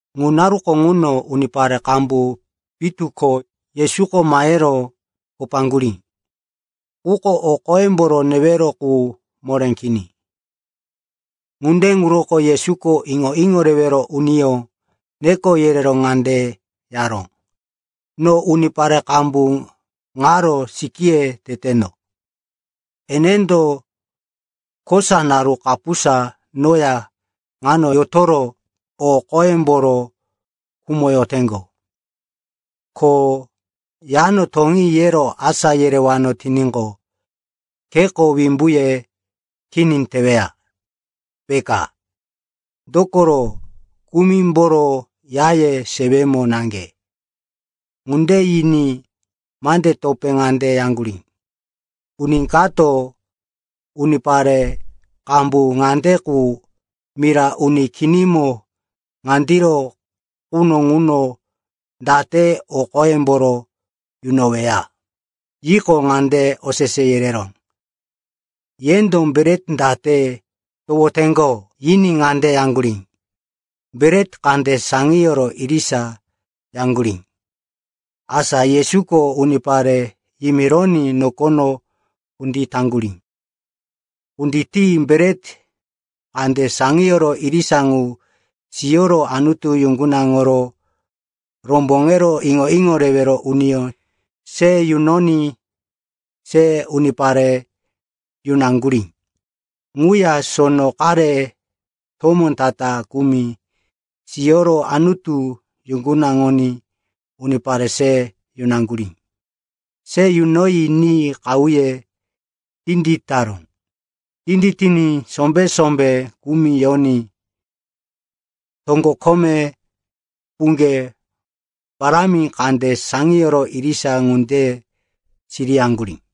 Ŋu naruko ŋuno unipare qambu pitu ko Yesuko mahero kopaŋgurí. Quko o qoyemboro newero qu moré kini. Ŋunde ŋuroko Yesuko iŋo-iŋo rewero uniyó neko yerero ŋande yaró, “No unipare qambu ŋaro sikíye teteno. Enendo kosa naru kapusa noya ŋano yotoro o qoyemboro khumoyoteŋgo. Ko, ‘Yano toŋi,’ yero asá yerewano tiníqo, kheko wimbuye kini teweya, peka. Dokoro kumimboro yaye sewemo naŋge.” Ŋunde yiní mande topé ŋande yaŋgurí, “Uni kato unipare qambu ŋande qu mira uni kinimo ŋandiro quno ŋuno date o qoyemboro yunoweya?” Yiqo, ŋande osese yereró, “Yendo bret date towoteŋgo?” Yiní ŋande yaŋgurí, “Bret kande saŋiyoro irisa,” yaŋgurí. Asa Yesuko unipare yimironí nokono kunditaŋgurí. Kunditi bret kande saŋiyo irisa ŋu siyoro Anutu yuŋgunaŋoro romboŋero iŋo-iŋo rewero uniyó se yunoní se unipare yunaŋgurí. Ŋuya sono qare tomó ta-ta kumi siyoro Anutu yuŋgunaŋoní unipare se yunaŋgurí. Se yunoyi ni qahuye tinditaró. Tinditiní sombé-sombé kumi yoní toŋgo kome puŋge parámi kande saŋiyoro irisa ŋunde siriyaŋgurí.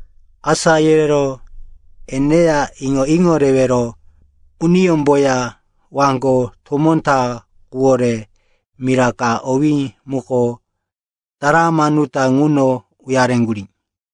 Asá yerero eneya, iŋo-iŋo rewero uniyómboya waŋgo tomó ta quwore mira ka owí muko Dalamanuta ŋuno uyareŋgurí.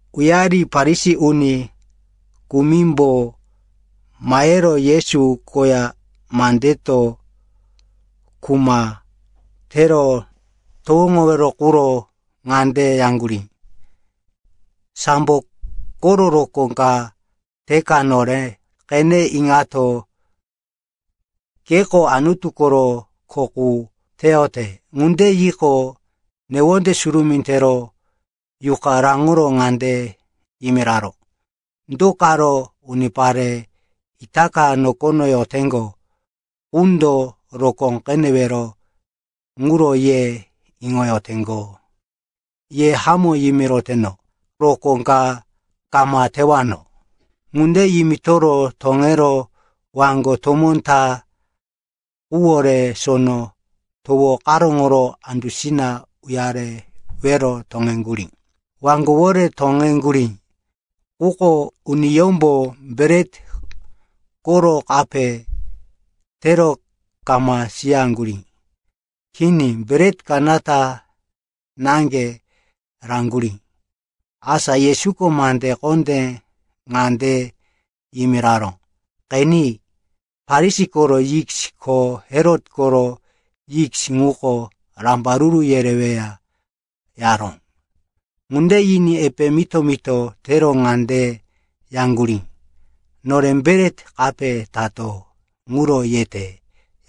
Uyari Farisi uni kumimbo mahero Yesu koya mandeto kuma tero towoŋowero quro ŋande yaŋgurí, “Sambo koro rokó ka teka nore qene iŋato, keko Anutu koro kho qu teyote.” Ŋunde yiqo, newonde surumí tero yuqa raŋoro ŋande yimiraró, “Do karo unipare itaka nokono yoteŋgo qundo rokó qenewero ŋuro ye iŋoyoteŋgo? Ye hamó yimiroteno, rokó ka kama tewano.” Ŋunde yimitoro toŋero waŋgo tomó ta quwore Sono Towo karóŋoro andusina uyarewero toŋeŋgurí. Waŋgowore toŋeŋgurí, quko uniyómbo bret koro kape tero kama siyaŋgurí. Kini, bret kanata naŋge raŋgurí. Asa Yesuko mande kondé ŋande yimiraró, “Qeni, Farisi koro yis ko Herot koro yis ŋuko rambaruru yereweya,” yaró. Ŋunde yiní epe mito-mito tero ŋande yaŋgurí, “Nore bret kape tato ŋuro yete,”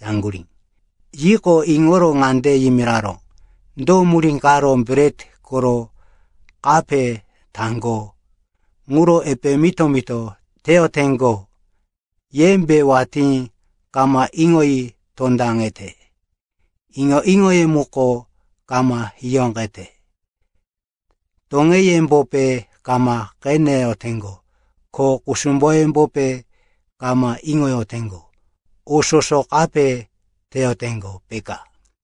yaŋgurí. Yiqo, iŋoro ŋande yimiraró, “Do murí karo bret koro kape taŋgo ŋuro epe mito-mito teyoteŋgo? Yembe watí kama iŋoyi tondaŋete? Iŋo-iŋoye muko kama hiyóqete? Toŋeyembope kama qeneyoteŋgo? Ko kusumboyembope kama iŋoyoteŋgo? O soso kape teyoteŋgo, peka?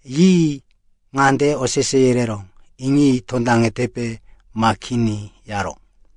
Yi ŋande osese yereró, “Iŋi tondaŋetepe ma kini?” yaró.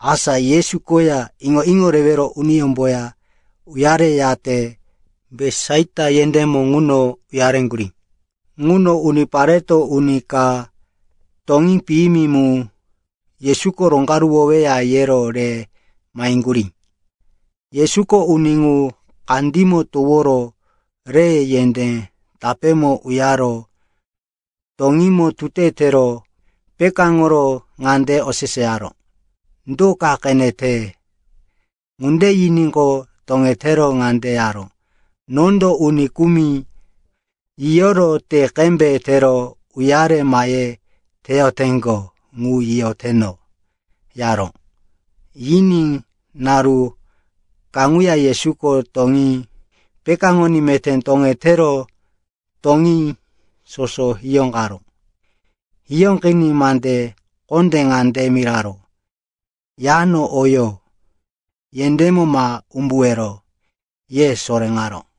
Asa Yesu koya iŋo-iŋo rewero uniyómboya uyareyate Betisaita yendémo ŋuno uyareŋgurí. Ŋuno unipareto, uni ka toŋí piyimi mu Yesuko roŋgaruwoweya, yero re maheŋgurí. Yesuko uni ŋu kandímo toworo re yendé tapémo uyaro toŋímo tute tero pekáŋoro ŋande oseseyaró, “Do ka qenete?” Ŋunde yiníqo, toŋetero ŋande yaró, “Nondo uni kumi yiyoro te qembe tero uyare mahe teyoteŋgo ŋu yiyoteno,” yaró. Yiní naru kaŋuya Yesuko toŋí pekáŋoní meté toŋetero toŋí soso hiyóqaró. Hiyóqiní mande kondé ŋande miraró, “Yano oyo yendémo ma umbuwero,” ye soréŋaró.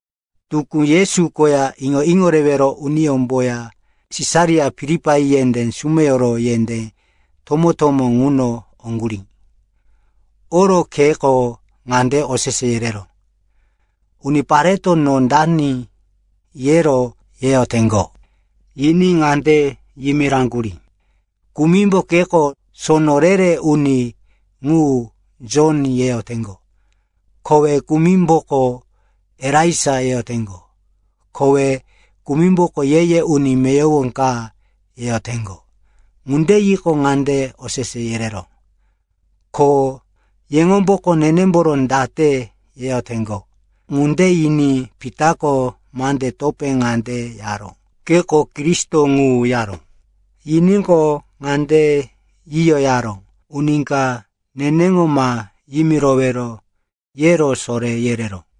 Tukú Yesu koya iŋo-iŋo rewero uniyómboya Sisaria Filipai yendé sumeyoro yendé tomó-tomó ŋuno oŋgurí. Oro kheko ŋande osese yereró, “Unipareto, no dani, yero yeyoteŋgo?” Yiní ŋande yimiraŋgurí, “Kumimbo keko sono re-re uni ŋu, Jon, yeyoteŋgo. Kowe kumimboko, Elaija, yeyoteŋgo. Kowe kumimboko, ye-ye uni meyowo ka, yeyoteŋgo.” Ŋunde yiqo, ŋande osese yereró, “Ko yeŋomboko, nenemboro date yeyoteŋgo?” Ŋunde yiní Pitako mande topé ŋande yaró, “Keko Kristo ŋu,” yaró. Yiníqo, ŋande yiyo yaró, “Uni ka neneŋo ma yimirowero,” yero soré yereró.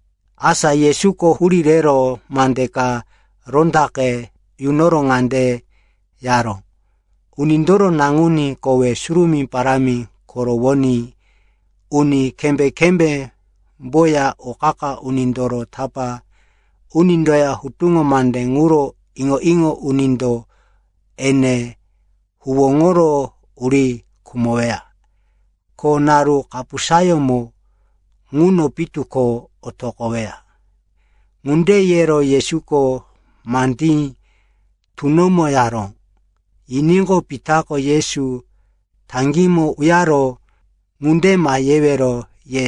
Asa Yesuko hurí rero mande ka rondaqe yunoro ŋande yaró, “Unindoro Naŋuní kowe surumí parámi korowoní, uni kembé-kembémboya o qa-qa unindoro tapá unindoya hutuŋo mande ŋuro iŋo-iŋo unindo ene huwóŋoro uri khumoweya. Ko naru kapusayómo ŋuno pitu ko otoqoweya.” Ŋunde yero Yesuko mandí tunomo yaró. Yiníqo, Pitako Yesu taŋgímo uyaro, “Ŋunde ma yewero,” ye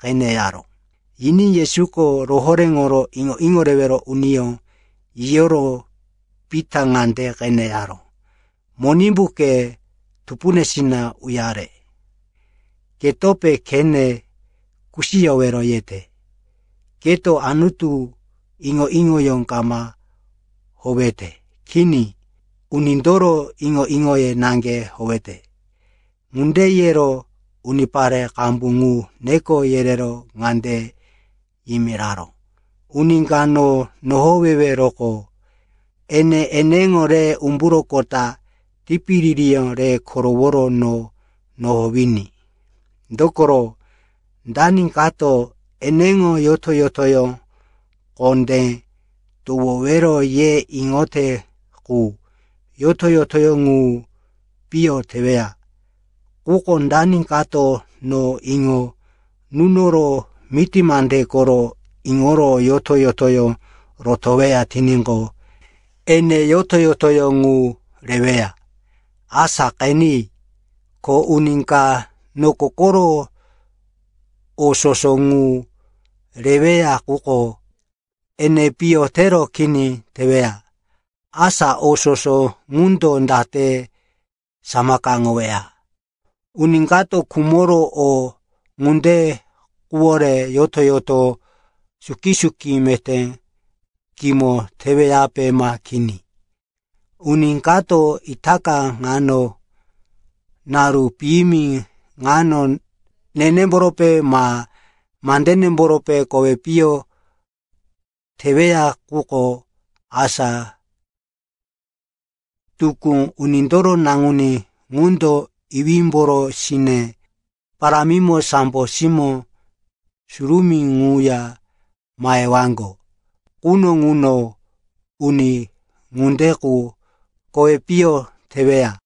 qene yaró. Yiní Yesuko rohoréŋoro iŋo-iŋo rewero uniyó yiyoro Pita ŋande qene yaró, “Monimbu, ke tupunesina uyare! Ketope khene kusiyowero yete. Keto Anutu iŋo-iŋoyó kama howete. Kini. Unindoro iŋo-iŋoye naŋge howete.” Ŋunde yero unipare qambu ŋu neko yerero ŋande yimiraró, “Uni ka no nohoweweroqo, ene eneŋo re umburoqota, tipiririyó re koroworo no nohowiní. Dokoro dani kato eneŋo yoto-yotoyó kondé towowero ye iŋote qu, yoto-yotoyó ŋu piyo teweya. Quko dani kato no iŋo nunoro miti mande koro iŋoro yoto-yotoyó rotoweya tiníqo, ene yoto-yotoyó ŋu reweya. Asa qeni, ko uni ka noko koro o soso ŋu reweya, quko ene piyo tero kini teweya, asa o soso ŋundo date samakaŋoweya. Uni kato khumoro o ŋunde quwore yoto-yoto suki-suki meté kimo teweyape ma kini? Uni kato itaka ŋano, naru piyimi ŋano, nenemborope ma mandenemboro kowi piyo teweya quko, asa tukú Unindoro Naŋuní ŋundo iwímboro sine parámimo sambo simó surumí ŋuya mahewaŋgo quno ŋuno uni ŋunde qu kowi piyo teweya.”